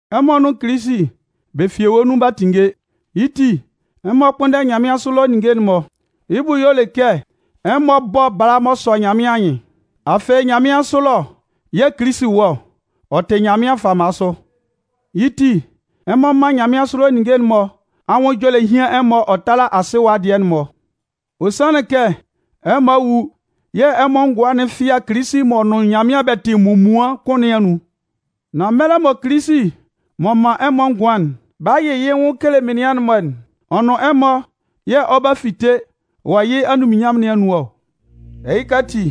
Ɛmɔ nʋn Kilisi bɛ fi ewue nun b'a tinnge. Yɩ́ ti, ɛmɔ kpʋ́nndɛ nyanmɩansʋ ɛlɔ ninnge'n-mɔ. Yɩ́ bʋ y'ɔ le kɛ ɛmɔ bɔ́ bala m'ɔ sɔ Nyanmɩan anyɩn. Afɩ nyanmɩansʋ ɛlɔ yɛ̂ Kilisi wɔ ɔ, ɔ tɩ Nyanmɩan fama sʋ. Yɩ́ ti, ɛmɔ mán nyanmɩansʋ ɛlɔ ninnge'n-mɔ anwʋn ɛjɔlɛ hían ɛmɔ ɔ tála asɩ ɛwa dɩɛ'n-mɔ. Ɔ sanlɩn kɛ ɛmɔ a wu yɛ̂ ɛmɔ ngʋan'n fɩa Kilisi m'ɔ nʋn Nyanmɩan bɛ tɩ munmuan kʋn nɩn anun. Nan mɛlɛ mɔ Kilisi m'ɔ man ɛmɔ ngʋan'n 'ba yɩ yɩ́ nwʋn kele menian'n-mɔ'n, ɔ nʋn ɛmɔ yɛ̂ ɔ 'ba fite wɔ yɩ́ anunminnyanmʋn nɩn anun ɔ. Ɛhɩka ati,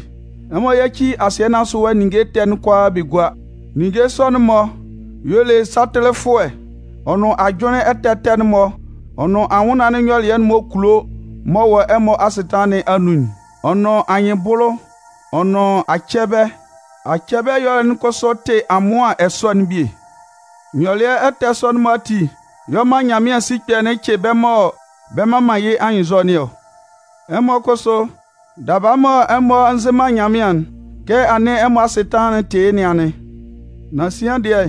ɛmɔ yáci asɩɛ nɩn asʋ ɛwa ninnge ɛtɛ'n kʋalaa bɛ gúa. Ninnge sɔ'n-mɔ y'ɔ le satɩlɩfʋɛ ɔ nʋn ajʋnlɩn ɛtɛ ɛtɛ'n-mɔ, ɔ nʋn anwʋnnaan'n nyɔlɩɛ m'ɔ kulo m'ɔ wɔ ɛmɔ asɩtanlan nɩn anun'n, ɔ nʋn anyɩnbʋlʋ, ɔ nʋn acɛbɛ. Acɛbɛ ɛyɔlɛ'n kʋsʋ tɩ amʋan ɛsɔ'n bie. Nyɔlɩɛ ɛtɛ sɔ'n-mɔ ati y'ɔ man Nyanmɩan sikpɛ'n cɩ bɛ́ mɔ bɛ mman man yɩ́ anyɩnnzɔ nɩn ɔ. Ɛmɔ kʋsʋ, daba mɔ ɛmɔ nzɩ man Nyanmɩan'n, kɛ anɩn ɛmɔ asɩtanlan'n tɩ yɩ́ nɩn anɩn. Nan sian dɩɛ,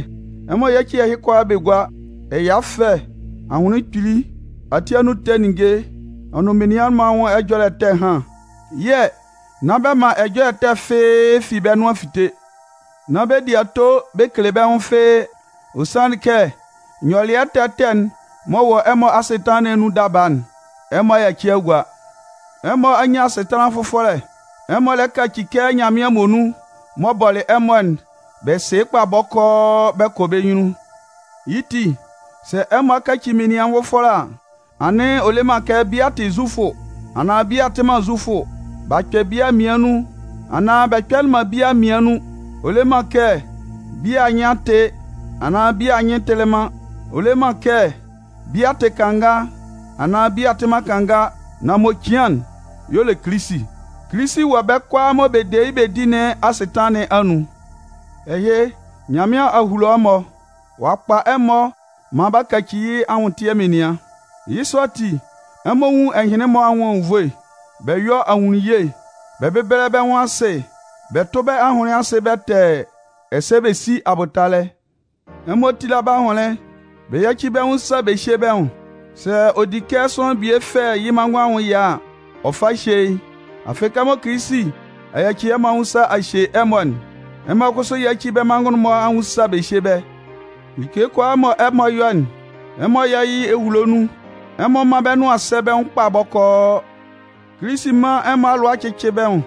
ɛmɔ yáci ɛhɩ kʋalaa bɛ gúa: ɛya ɛfɛ, ahʋnlɩn kpili, ati anun ɛtɛ ninnge, ɔ nʋn menian anwʋn ɛjɔlɛ ɛtɛ ɛhan. Yɛ̂ nán bɛ man ɛjɔlɛ ɛtɛ fɩ́ɩ́ fi bɛ́ nʋan fite. Nán bɛ di ato bɛ kele bɛ́ nwʋn fɩ́ɩ́ kʋ́n. Ɔ sanlɩn kɛ nyɔlɩɛ ɛtɛ ɛtɛ m'ɔ wɔ ɛmɔ asɩtanlan nɩn anun daba'n, ɛmɔ a yaci a gua. Ɛmɔ a nyan asɩtanlan fʋfɔlɛ. Ɛmɔ lɛ kaci kɛ Nyanmɩan muonun m'ɔ bɔlɩ ɛmɔ'n bɛ sɩ yɩ́ kpa bɔkɔɔ bɛ kɔ bɛ́ nyunnun. Yɩ́ ti, sɛ ɛmɔ a kaci menian nvʋfɔlɛ a, anɩn ɔ le man kɛ bia tɩ Zufʋ, anaan bia tɩ man Zufʋ, b'a kpɛ bia mmian nun, anaan bɛ kpɛlɩ man bia mmian nun. Ɔ le man kɛ bia anyɩn a tɩ, anaan bia anyɩn tɩlɩ man. Ɔ le man kɛ bia tɩ kanga, anaan bia tɩ man kanga. Nan m'ɔ cian'n y'ɔ le Kilisi. Kilisi wɔ bɛ́ kʋalaa mɔ bɛ de yɩ́ bɛ di nɩn asɩtanlan nɩn anun. Ɛhɩ, Nyanmɩan a hulo ɛmɔ, ɔ'a kpa ɛmɔ maan b'a kaci yɩ́ anwʋntɩɛ menian. Yɩ́ sɔ ati, ɛmɔ nwún ɛhɩnlɩn-mɔ anwʋn anwunnvoe, bɛ yɔ́ ahunnunye, bɛ bɛ́bɛlɛ bɛ́ nwʋn asɩ, bɛ tʋ́ bɛ́ ahʋnlɩn asɩ bɛtɛɛ, ɛsɛ bɛ sí abʋtalɛ. Ɛmɔ tíla bɛ́ ahʋnlɩn bɛ yáci bɛ́ nwʋn sa bɛ hyé bɛ́ nwʋn. Sɛ ɔ di kɛ sʋanlan bie fɛ yɩ́ manngʋn anwʋn ɛya a, ɔ fá hyé yɩ́. Afɩ kɛmɔ Kilisi a yaci ɛmɔ anwʋn sa ɔ'a hye ɛmɔ'n, ɛmɔ kʋsʋ yáci bɛ́ manngʋn'n-mɔ anwʋn sa bɛ hyé bɛ́. Like kʋalaa mɔ ɛmɔ 'yɔ'n, ɛmɔ yɔ́ yɩ́ ehulo nun, ɛmɔ mán bɛ́ nʋan sɛ́ bɛ́ nwʋn kpa bɔkɔɔ. Kilisi mán ɛmɔ alʋa cɩ́cɩ bɛ́ nwʋn.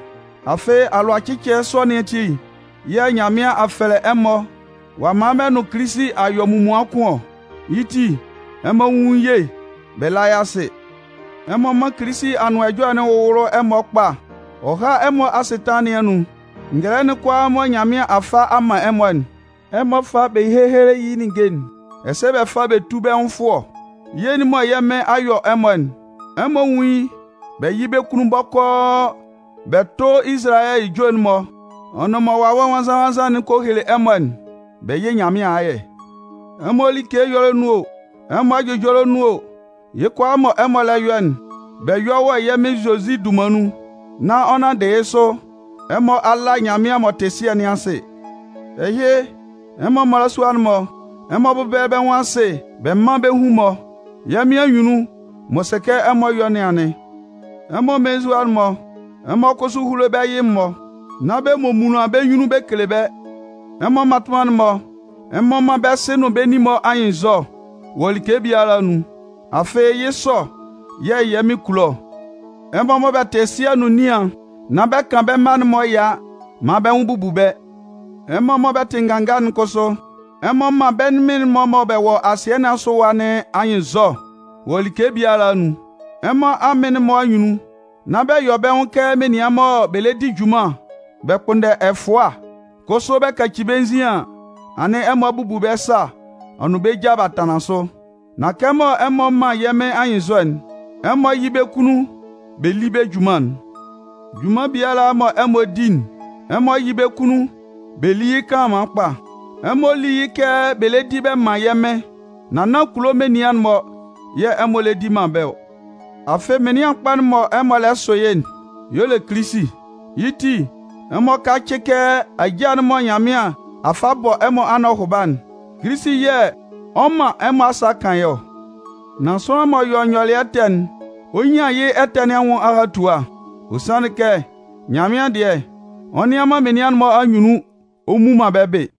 Afɩ alʋacɩcɩɛ sɔ nɩn ati yɛ̂ Nyanmɩan a fɛlɛ ɛmɔ ɔ'a man bɛ nʋn Kilisi a yɔ munmuan kʋn ɔ. Yɩ́ ti, ɛmɔ nwún ye bɛ lá yɩ́ asɩ. Ɛmɔ mán Kilisi Anʋan Ɛjɔlɛ'n wʋ́wʋlʋ ɛmɔ kpa, ɔ há ɛmɔ asɩtanlan nɩn anun. Ngɛlɛ'n kʋalaa mɔ Nyanmɩan a fa a man ɛmɔ'n, ɛmɔ fá bɛ héhele yɩ́ ninnge'n, ɛsɛ bɛ fá bɛ tú bɛ́ nwʋn fʋɔ. Ye'n mɔ Nyanmɩan a yɔ ɛmɔ'n, ɛmɔ nwún yɩ́ bɛ yɩ́ bɛ́ kunnun bɔkɔɔ bɛ tʋ́ Izalayɛ ejue'n-mɔ, ɔ nʋn mɔ Wawɛ Nwannzan-nwannzan'n kɔ hele ɛmɔ'n bɛ yɩ́ Nyanmɩan ayɛ. Ɛmɔ like ɛyɔlɛ nun o, ɛmɔ ɛjʋjɔlɛ nun o, yɩ́ kʋalaa mɔ ɛmɔ lɛ yɔ'n, bɛ yɔ́ wɔ yɛ́ Mɩn Zozi dunman nun, nán ɔ nanndɩ yɩ́ sʋ, ɛmɔ a la Nyanmɩan m'ɔ tɩ Sɩɛ nɩn asɩ. Ɛhɩ, ɛmɔ mmalasua'n-mɔ, ɛmɔ bɛ́bɛlɛ bɛ́ nwʋn asɩ bɛ mán bɛ́ hun-mɔ. Yɛ́ Mɩn anyunnun, m'ɔ sɛ kɛ ɛmɔ yɔ nɩn anɩn. Ɛmɔ mmelenzua'n-mɔ, ɛmɔ kʋsʋ húlo bɛ́ yɩ-mɔ, nán bɛ momunlan bɛ́ nyunnun bɛ kele bɛ́. Ɛmɔ mmatʋnman'n-mɔ, ɛmɔ mán bɛ́ sɩ nʋn bɛ́ nin-mɔ anyɩnnzɔ wɔ like biala anun. Afɩ yɩ́ sɔ yɛ̂ yɛ́ Mɩn kulo ɔ. Ɛmɔ mɔ bɛ tɩ sɩɛ nʋn nian'n, nán bɛ kan bɛ́ mma'n-mɔ ɛya maan bɛ́ nwʋn bubu bɛ́. Ɛmɔ mɔ bɛ tɩ nganga'n kʋsʋ, ɛmɔ mán bɛ́ mɩn-mɔ mɔ bɛ wɔ asɩɛ nɩn asʋ ɛwa nɩn anyɩnnzɔ wɔ like biala anun. Ɛmɔ amɩn'n-mɔ anyunnun, nán bɛ yɔ bɛ́ nwʋn kɛ menian mɔ bɛ le di junman bɛ kpʋnndɛ ɛfʋa, kʋsʋ bɛ kaci bɛ́ nzin an, anɩn ɛmɔ a bubu bɛ́ sa ɔ nʋn bɛ ja b'a tanlan sʋ. Nan kɛmɔ ɛmɔ man yɛ́ Mɩn anyɩnnzɔ'n, ɛmɔ yɩ́ bɛ́ kunnun bɛ lí bɛ́ junman'n. Junman biala mɔ ɛmɔ 'di'n, ɛmɔ yɩ́ bɛ́ kunnun bɛ lí yɩ́ kanlanman kpa. Ɛmɔ lí yɩ́ kɛ bɛ le di bɛ man yɛ́ Mɩn, nan nán kulo menian'n-mɔ yɛ̂ ɛmɔ lɛ di man bɛ́ ɔ. Afɩ Mɩnlɩan kpa'n mɔ ɛmɔ lɛ sʋ yɩ́'n y'ɔ le Kilisi. Yɩ́ ti, ɛmɔ kácɩ kɛ ajâ'n mɔ Nyanmɩan a fa a bɔ ɛmɔ anɔhʋba'n, Kilisi yɛ̂ ɔ 'man ɛmɔ asa 'kan yɩ́ ɔ. Nan sʋanlan m'ɔ yɔ nyɔlɩɛ ɛtɛ'n, ɔ 'nyan yɩ́ ɛtɛ nɩn anwʋn ahatua. Ɔ sanlɩn kɛ Nyanmɩan dɩɛ, ɔ nnɩan man menian'n-mɔ anyunnun ɔ mmu man bɛ́ bɩ.